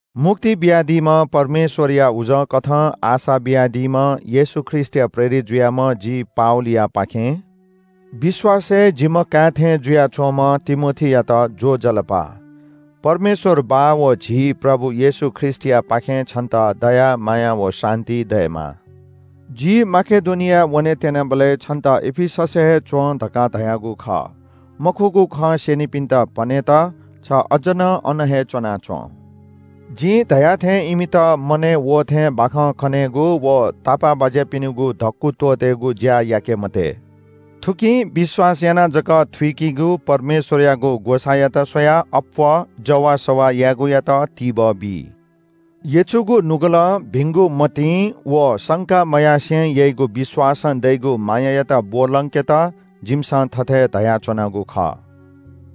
मुक्ति बियादीम्‍ह परमेश्‍वरया उजंकथं आशा बियादीम्‍ह येशू ख्रीष्‍टया प्रेरित जुयाम्‍ह जि पावलयापाखें विश्‍वासय् जिम्‍ह काय् थें जुयाच्‍वंम्‍ह तिमोथीयात ज्‍वजलपा। परमेश्‍वर बाः व झी प्रभु येशू ख्रीष्‍टयापाखें छन्‍त दया माया व शान्‍ति दयेमा। जि माकेडोनियाय् वने त्‍यनाबलय् छन्‍त एफिससय् हे च्‍वँ धकाः धयागु खः। मखुगु खँ स्‍यनिपिन्‍त पनेत छ अज्‍ज नं अन हे च्‍वनाच्‍वँ। जिं धया थें इमित मनय् वः थें बाखं कनेगु व तापाःबाज्‍यापिनिगु धक्‍कु त्‍वःतेगु ज्‍या याके मते। थुकिं विश्‍वास यानाः जक थुइगु परमेश्‍वरयागु ग्‍वसाःयात स्‍वयाः अप्‍वः जवाःसवाः यायेगुयात तिबः बी। यचुगु नुगलं, भिंगु मतिं व शंका मयासें याइगु विश्‍वासं दइगु मायायात ब्‍वलंकेत जिमिसं थथे धयाच्‍वनागु खः।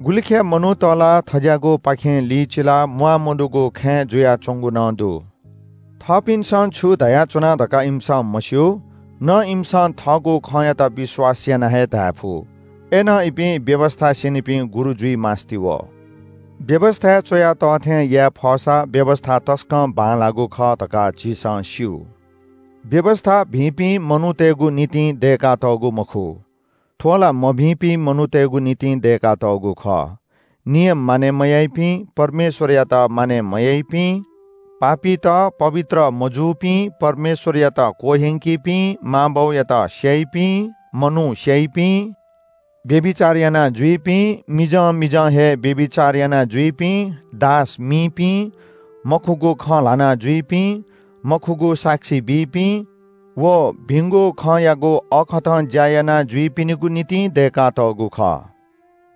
गुलिखय् मनूत ला थज्‍याःगुपाखे लिचिलाः म्‍वाःमदुगु खँय् जुयाच्‍वंगु नं दु। थःपिन्‍सं छु धयाच्‍वना धकाः इमिसं मस्‍यू, न इमिसं थःगु खँयात विश्‍वास यानाः हे धायेफु। अय्‌नं इपिं व्‍यवस्‍था स्‍यनीपिं गुरु जुइ मास्‍ति वः। व्‍यवस्‍थाय् च्‍वया तः थें याये फःसा व्‍यवस्‍था तसकं बांलाःगु खः धकाः झीसं स्‍यू। व्‍यवस्‍था भिंपिं मनूतय्‌गु निंतिं दय्‌कातःगु मखु। थ्‍व ला मभिंपिं मनूतय्‌गु निंतिं दय्‌कातःगु खः। नियम मानय् मयाइपिं, परमेश्‍वरयात मानय् मयाइपिं, पापीत, पवित्र मजूपिं, परमेश्‍वरयात क्‍वह्यंकीपिं, मां बौयात स्‍याइपिं, मनू स्‍याइपिं, व्‍यभिचार यानाजुइपिं, मिजं मिजं हे व्‍यभिचार यानाजुइपिं, दास मीपिं, मखुगु खँ ल्‍हानाजुइपिं, मखुगु साक्षी बीपिं व भिंगु खँयागु अःखतं ज्‍या यानाजुइपिनिगु निंतिं दय्‌कातःगु खः।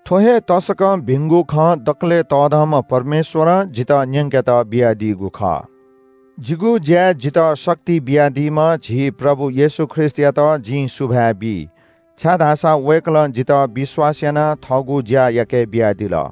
थ्‍व हे तसकं भिंगु खँ दकलय् तःधंम्‍ह परमेश्‍वरं जितः न्‍यंकेत बियादीगु खः। जिगु ज्‍याय् जितः शक्ति बियादीम्‍ह झी प्रभु येशू ख्रीष्‍टयात जिं सुभाय् बी, छाय्‌धाःसा वय्‌कलं जितः विश्‍वास यानाः थःगु ज्‍या याकेबियादिल।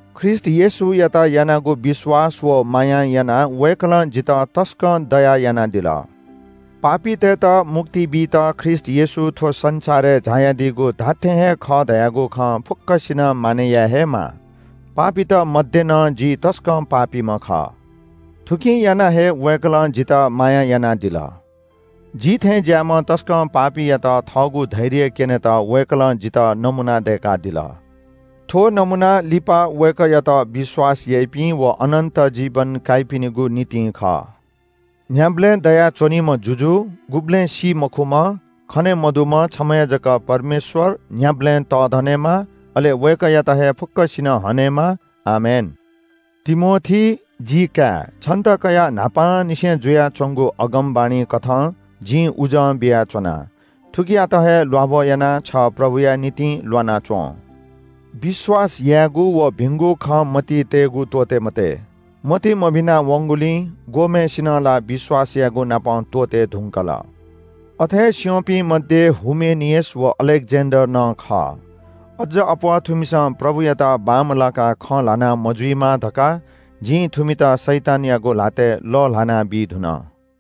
ख्रीष्‍ट येशूयात यानागु विश्‍वास व मायां यानाः वय्‌कलं जितः तसकं दया यानादिल। पापीतय्‌त मुक्ति बीत ख्रीष्‍ट येशू थ्‍व संसारय् झायादीगु धात्‍थें हे खः धयागु खँ फुक्‍कसिनं मानय् याये हे माः। पापीत मध्‍ये नं जि तसकं पापीम्‍ह खः। थुकिं यानाः हे वय्‌कलं जितः माया यानादिल। जि थें ज्‍याःम्‍ह तसकं पापीयात थःगु धैर्य क्‍यनेत वय्‌कलं जितः नमूना दय्‌कादिल। थ्‍व नमूना लिपा वय्‌कःयात विश्‍वास याइपिं व अनन्‍त जीवन काइपिनिगु निंतिं खः। न्‍ह्याबलें दयाच्‍वनीम्‍ह जुजु, गुबलें सी मखुम्‍ह, खने मदुम्‍ह छम्‍ह हे जक परमेश्‍वर न्‍ह्याबलें तःधनेमा अले वय्‌कःयात हे फुक्‍कसिनं हनेमा। आमेन। तिमोथी, जिकाय्, छन्‍त कयाः न्‍हापांनिसें जुयाच्‍वंगु अगमवाणी कथं जिं उजं बियाच्‍वना। थुकियात हे ल्‍वाभः यानाः छ प्रभुया निंतिं ल्‍वाना च्‍वँ। विश्‍वास यायेगु व भिंगु खँ मतिइ तयेगु त्‍वःते मते। मति मभिना वंगुलिं ग्‍वःम्‍हय्‌सिनं ला विश्‍वास यायेगुनापं त्‍वःते धुंकल। अथे स्‍यंपिं मध्‍ये हुमेनियस व अलेक्‍जेन्‍डर नं खः। अज्‍ज अप्‍वः थुमिसं प्रभुयात बांमलाकाः खँ ल्‍हाना मजुइमा धकाः जिं थुमित शैतानयागु ल्‍हातय् लःल्‍हानाबी धुन।